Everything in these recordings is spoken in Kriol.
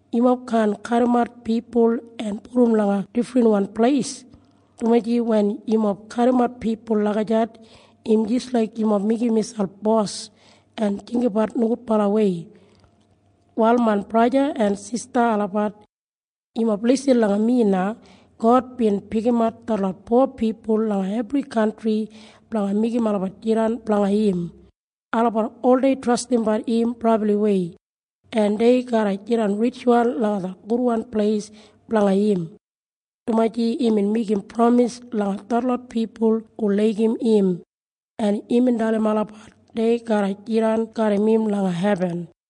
Yumob kaan kadimat pipul en pudum langa difrinwan pleis, dumaji wen yumob kadimat pipul lagijat, im jis laik yumob meigim miselp bos, en jinggabat nogudbalawei. Wal main braja en sista olabat, yumob lisin langa mi na. God bin pikimat detlot po pipul langa ebri kantri blanga meigim olabat jidan blanga im. Olabat oldei trastimbat im brabliwei, en dei garra jidan ritjwan langa det gudwan pleis blanga im, dumaji imbin meigim pramis langa detlot pipul hu laigim im, en imbin dalim olabat dei garra jidan garram im langa hebin.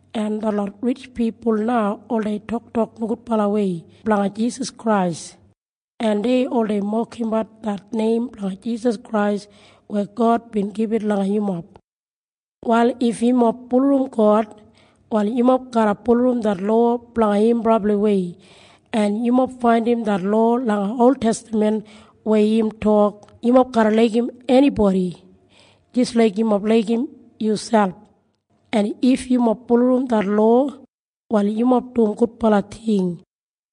En detlot ritj pipul na oldei toktok nogudbalawei blanga Jisas Krais, en dei oldei mokimbat det neim blanga Jisas Krais weya God bin gibit langa yumob. Wal if yumob bulurrum God, wal yumob garra bulurrum det lowa blanga im brabliwei. En yumob faindim det lowa langa oltestaman weya im tok, “Yumob garra laigim enibodi jis laik yumob laigim yuselp.” En if yumob bulurrum det lowa, wal yumob dum gudbala ting.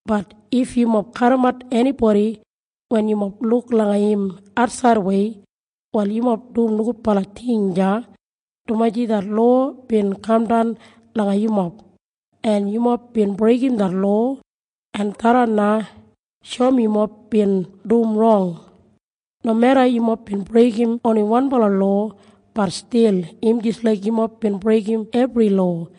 Bat if yumob kadimat enibodi wen yumob luk langa im atsaidwei, wal yumob dum nogudbala ting deya, dumaji det lowa bin kamdan langa yumob, en yumob bin breigim det lowa, en tharran na shoum yumob bin dum rong. Nomeda yumob bin breigim oni wanbala lowa, bat stil im jis laik yumob bin breigim ebri lowa.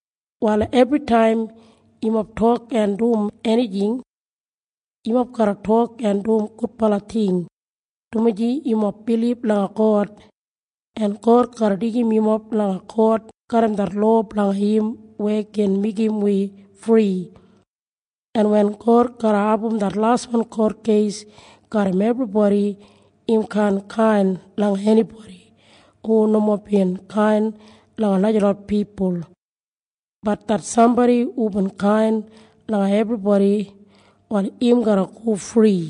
Wal ebritaim yumob tok en dum enijing, yumob garra tok en dum gudbala ting, dumaji yumob bilib langa God, en God garra deigim yumob langa kot garram det lowa blanga im weya gin meigim wi fri, en wen God garra abum det laswan kotkeis garram ebribodi, im kaan kain langa enibodi hu nomo bin kain langa najalot pipul. Bat det sambodi hubin kain langa ebribodi, wal im garra go fri.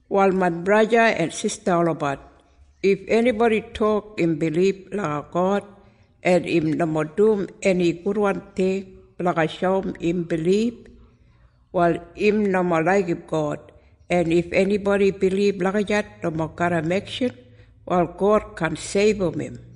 Wal main braja en sista olabat, if enibodi tok im bilib langa God, en im nomo dum eni gudwan ting blanga shoum im bilib, wal im nomo laigim God. En if enibodi bilib lagijat nomo garram ekshan, wal God kaan seibum im.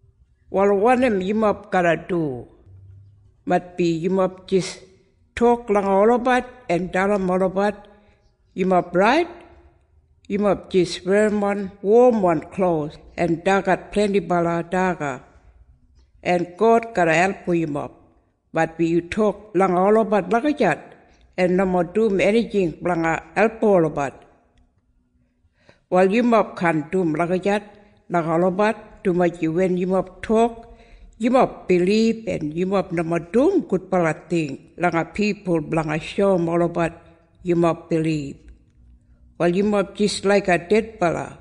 Wal wanim yumob garra du? Maitbi yumob jis tok langa olabat en dalim olabat, “Yumob rait. Yumob jis werrimon womwan klos en dagat blendibala daga, en God garra album yumob.” Maitbi yu tok langa olabat lagijat en nomo dum enijing blanga album olabat. Wal yumob kaan dum lagijat langa olabat, dumaji wen yumob tok yumob bilib en yumob nomo dum gudbala ting langa pipul blanga shoum olabat yumob bilib, wal yumob jis laiga dedbala.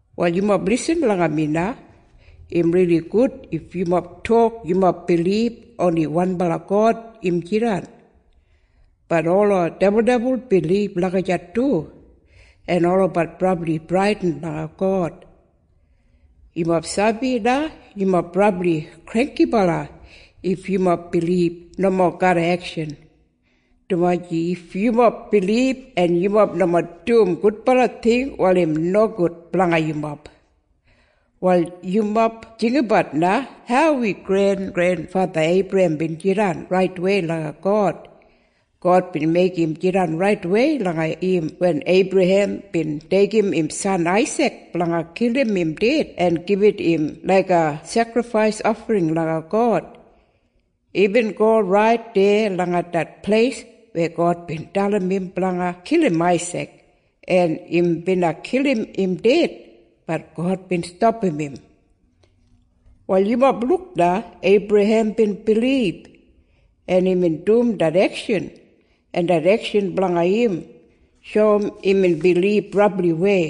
Wal yumob lisin langa mi na. Im rili gud if yumob tok yumob bilib oni wanbala God im jidan. Bat ola dibuldibul bilib lagijat du, en olabat brabli bradin langa God. Yumob sabi na yumob brabli granggibala if yumob bilib nomo garram ekshan, dumaji if yumob bilib en yumob nomo dum gudbala ting, wal im nogud blanga yumob. Wal yumob jinggabat na hau wi grengrenfatha Eibrahem bin jidan raitwei langa God. God bin meigim im jidan raitwei langa im wen Eibrahem bin deigim im san Aisik blanga kilim im ded en gibit im laiga sekrifais ofring langa God. Imbin go rait deya langa det pleis weya God bin dalim im blanga kilim Aisik, en im bina kilim im ded. Bat God bin stapam im. Wal yumob luk na. Eibrahem bin bilib, en imbin dum det ekshan. En det ekshan blanga im, shoum imbin bilib brabliwei.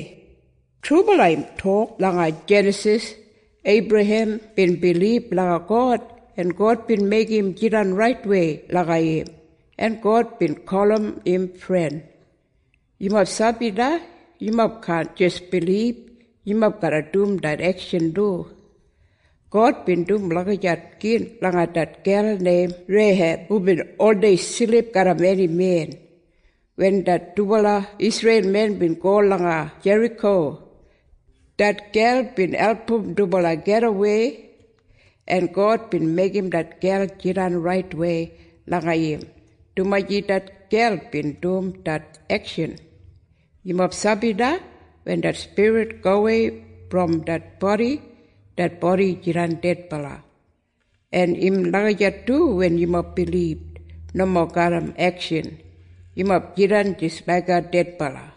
Trubala im tok langa Jenasis, “Eibrahem bin bilib langa God, en God bin meigim im jidan raitwei langa im, en God bin gulum im fren.” Yumob sabi na yumob kaan jis bilib. Yumob garra dum det ekshan du. God bin dum lagijat gin langa det gel neim Reiheb hubin oldei silip garram eni men. Wen det dubala Isreil men bin go langa Jeriko, det gel bin album dubala gidawei, en God bin meigim det gel jidan raitwei langa im, dumaji det gel bin dum det ekshan. Yumob sabi na wen det spirit gowei brom det bodi, det bodi jidan dedbala. En im lagijat du wen yumob bilib nomo garram ekshan. Yumob jidan jis laiga dedbala.